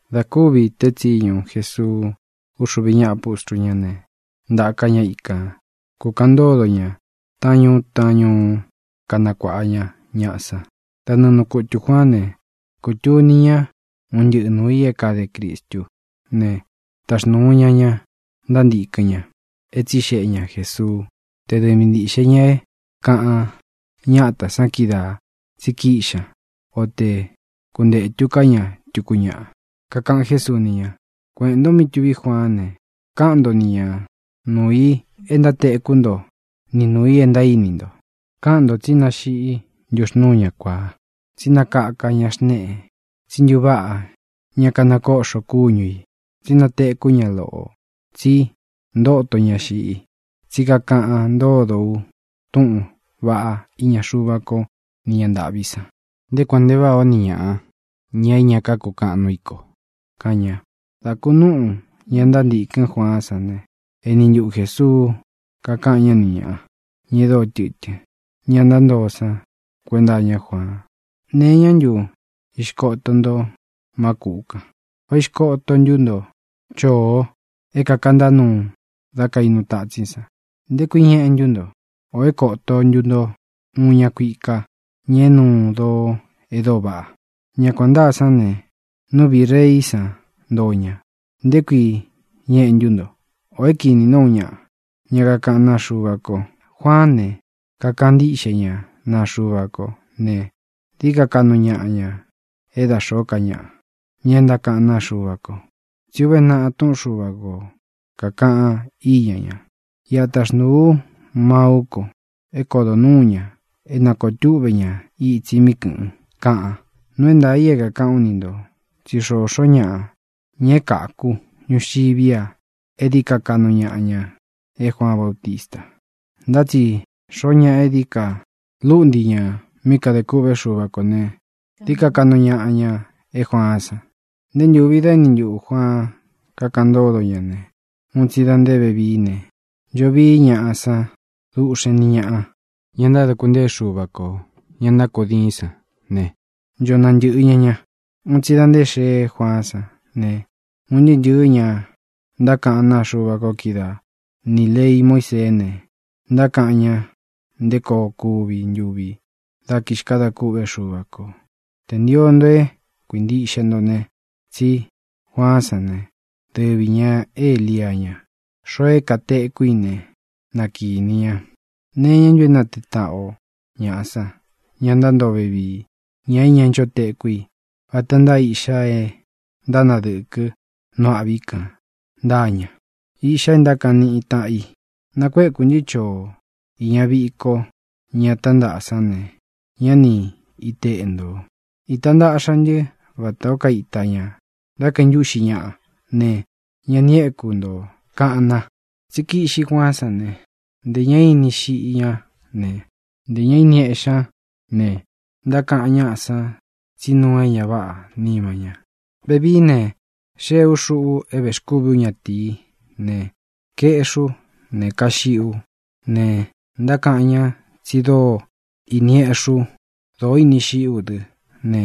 Dā kúvi teé tsiñu Jesuu úxuvi ñáꞌa pustru ñá ne, ntaka ña ikan, kūkaꞌan ntódo ña taꞌán ñuu taꞌán ñuú, kanakuāꞌa ña ñaꞌa san. Da nɨɨ nuu kutū Juaán ne, kūtuni ña un ntɨꞌɨ̄ nuu i é kade Cristú ne, taxnūu ña ña ntántīkɨn ña é tsixeꞌe ña Jēsuu té dɨvi ntiꞌxe ñā é kāꞌan ñátā san kídaā tsí kiꞌxi ña, o te kuntetū ká ña tuku ñaꞌa. Kakaꞌan Jésuu ni ña: —Kueꞌēn nto mí tuví Juaán ne, káꞌan nto ni ñā nuu i é ntátekú nto ni nūu i é ntaíni nto. Káꞌan ntō tsi náxiꞌí ntuxnūú ña kuāá, tsi nákaka ña xnéꞌe, tsí ntuváꞌa ñá kanakóꞌxo kúñu ī, tsi nátekú ña loꞌō, tsi ntóto ña xiꞌi, tsí kakaꞌan ntódo u túꞌūn vaꞌá iña Xuva ko ni ñá ntāꞌví san. ¡Nté kuān nte váꞌā ó ni ñaꞌa, ña é ña kákukaꞌan núu i ko! —kaꞌan ña. Dā kunúꞌu ña ntántīkɨ́n Juaán san ne, eni ntuꞌu Jēsuu kakaꞌan ñá nī ñāꞌa, ña e dóo tɨtɨ́n, ña ntántoo san, kuenta iñá Juaan: —¿Nee iñá ntu ixkoto nto má kūꞌu kan? ¿Vá ixkoto ntú nto choo é kākantá nuu da kainu tatsín san? ¿Nté kui ñeꞌe ntu nto? ¿Ō é kōto ntu nto uun ña kuika, ña é nuu doo e dóo vaꞌa? Ña kuān ntáa sán ne, nú viꞌī reí san ntoo ña. ¿Nté kui ñeꞌe ntu nto? ¿Ō é kīni ntó uun ñaꞌa, ña kakaꞌán naa Xuva ko? Juaán ne, kakaꞌan ntíꞌxe ña naa Xuva ko ne, dií ka kaꞌnu ñaꞌa ña é da xōó ka ñaꞌa, ña e ntákaꞌán naa Xuva ko. Tsí uve naꞌa túꞌun Xuva ko, kākaꞌan íña ña: Iꞌa taxnūu ú maú ko é kodo nuū ña, é nakōo túꞌve ña itsi mí kɨ̄ꞌɨn, kaꞌan. Nuu é ntaā i é kākaꞌán u ni ntō tsí xoxó ñaꞌa, ña e káku ñuxiví a, e dií ka kaꞌnu ñaꞌa ña é Juaan Bautista. Ntá tsi xoo ñaꞌa é dií ka lúꞌnti ñā mí kadē kûꞌvé Xuva kō ne, dií ka kaꞌnu ñaꞌa ña é Juaán san. ʼNté ntūvi dá eni ntuꞌū Juaan kakaꞌan ntódo ña ne, un tsi da nté vevií ne, ncho vií ñaꞌa san dúꞌxen ni ñāꞌa, ña ntáduku ntée Xuva kō. Ña ntákudiin san ne, ncho nantɨ̄ꞌɨ ña ña. Un tsi da nté xeé Juaán san ne, un ntɨɨ́ ntɨ̄ɨ́ ña ntákaꞌán naa Xuva ko kídaa, nī lei Muísee ne, ntákaꞌan ñá nté koo kuvi ntuvi dá kixkadā kûꞌvé Xuva kō. Tē ntio nto é kuīntiꞌxe nto ne, tsí Juaán san ne, dɨvi ñā é Elia ña. Xoo é kātekú i ne, na kīni ña. ʼ¿Nee iñá ntu é natee taꞌan o ñaꞌa san, ña ntántoo vevii, ña é ñá ncho tekú i? Vata ntáa iꞌxá e ntánadɨkɨ nu âꞌví kān ntáa ña, iꞌxa é ntákaꞌan níꞌi tāꞌan i: “Nakuékū ntɨ choo iña viko ña tántaꞌa san ne, ñá ni iteꞌe ntō; īta ntaꞌxa ntɨ́ vatā ó kaita ña da kaíntuꞌxi ñaꞌa ne, ña ni éku ntō”, kaꞌan na. Tsí kiꞌxi Juaán san ne, ntē ñá ini xiꞌi ñá ne, ntē ñá ini eꞌxi ñá ne, ntákaꞌan ñaꞌa san tsí nuu é ña váꞌā nima ña. Vevií ne, xéē ú, xuꞌu é vēxkúvi ú ñatīí ne, kaeꞌxí u ne, kaxiꞌi ú ne, ntákaꞌan ña tsi dóo ini eꞌxí u, dóo ini xiꞌi ú dɨ ne,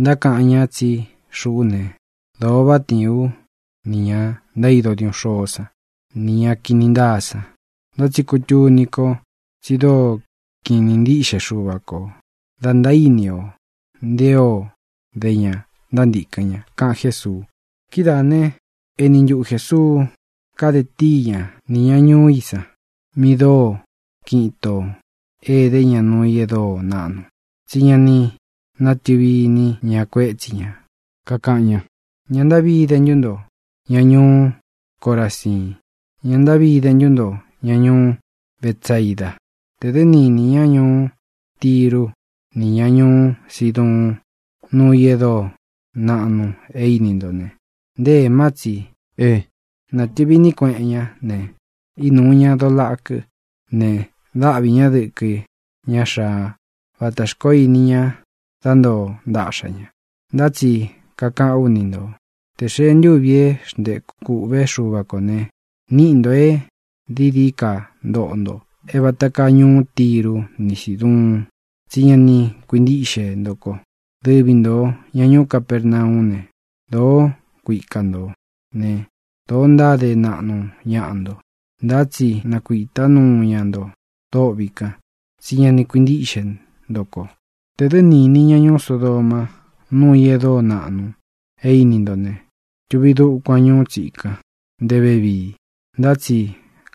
ntákaꞌan ña tsí xuꞌú ne, dōo váꞌa tiin ú nī ña ntaído diuꞌun xôó san nī ña kini ntáa san. Ntá tsi kutuni ko tsi dóo kiꞌin īní ntiꞌxe Xuva kō da ntaíni o nté o de ña ntántīkɨn ña —kaꞌan Jésuu. Kidáā né, eni ntuꞌu Jēsuu kade tíi ña nī ña ñuú i san, mí dóo kiꞌin itó ede ña nuu i é dóo naꞌnu, tsí ña ni nátɨvi īní ña kuétsi ña. Kakaꞌan ña: —¡Ña ntáꞌvi ide ntu nto, ña ñuú Coraziin! ¡Ña ntáꞌvi ide ntu nto, ña ñuú Betsaida! Tē dɨ́ ni īni ña ñuú Tiru ni ñá ñuú Siduun núu i e dóo naꞌnu é īni nto ne, nté ēmá tsi é nātɨvi iní kueꞌen ñá ne, ínūu ña doo lakɨ́ ne, dáꞌvi ñā dɨkɨ ña xáā vátā xkoó ini ña dá ntoo ntaꞌxa ña. Ntá tsi kakaꞌán u ni nto, tē xee ntúvī é xntēkú kūꞌvé Xuva kō ne, níꞌi ntō e dií dií ka ntoꞌo nto é vāta káa ñuú Tiru ni Síduun, tsí ña ni kuintíꞌxe nto ko. Dɨvi ntō, ña ñuú Capernaú ne, dōó kuika ntō né, dōo ntáde naꞌnu ñaꞌa nto. Ntá tsi nakuītá nuu ña nto dôꞌvi kan, tsí ña ni kuintíꞌxe nto ko. Tē dɨ́ ni īni ña ñuú Sodoma núu i e dóo naꞌnu é īni ntó ne, tuvi dukuan ñuú tsikan nté vevii. Ntá tsi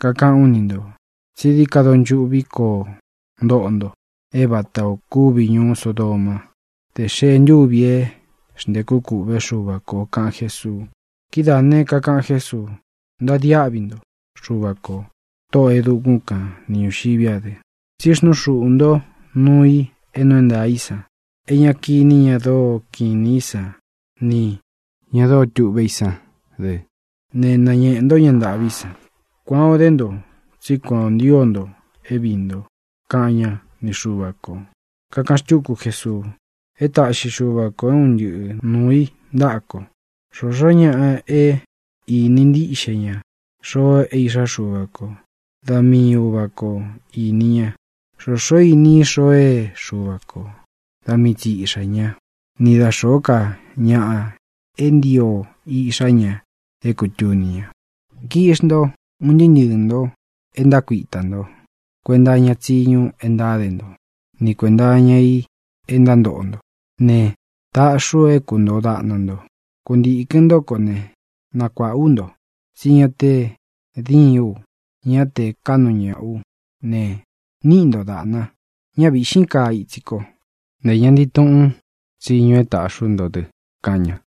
kakaꞌán u ni ntō tsí dií ka donchuꞌvi koo ntoꞌo nto, é vatā o kúvi ñūú Sodomá tē xee ntúvī é xntēkú kūꞌvé Xuva kō —kaꞌan Jésuu. Kidáā ne, kakaꞌan Jésuu: —Ntadiáꞌvi nto, Xuvā ko, Tóꞌō e dukún kān ni ñūxiví a dɨ, tsí xnuu xuꞌū ntó nuu i é nuu é ntaā í san é ña kiní ña dóo kiꞌin inī í san nī ña dóo tuꞌvé i sán dɨ ne, nañēꞌe ntó ña ntāꞌví san. Kuán ō dé nto, tsí kuan ō ntío nto é viī nto —kaꞌan ñá ni Xuva kō. Kakaꞌan xtúku Jesuu: —É taꞌxi Xuva kō é un ntɨꞌɨ nuu i ntāꞌa ko. Xōxó ñaꞌa é īni ntíꞌxe ña xoo é Iꞌxá Xuva ko, da mii Uvā kó ini ña. Xōxó īni i xoo é Xuva kō, da mii tsi Iꞌxā ñá, ni da xōó ka ñaꞌa é ntio Iꞌxá ña é kūtuni ña. Kiꞌxi nto, un ntɨɨ́ ntɨɨ̄ nto e ntákuitā nto kuenta iña tsíñu e ntáde nto, ni kuēnta iña i e ntántoꞌo nto ne, taꞌxi u é kūntoo daꞌna nto. Kuntīkɨn ntó ko ne, nakuāꞌa ú nto. Tsí ña te díin u, ñá te kaꞌnu ñāꞌa ú ne, níꞌi nto dāꞌna. Ñá vīꞌxín kaa itsi ko, ntē ña ntii tuꞌún tsiñu é tāꞌxi ú nto dɨ —kaꞌan ña.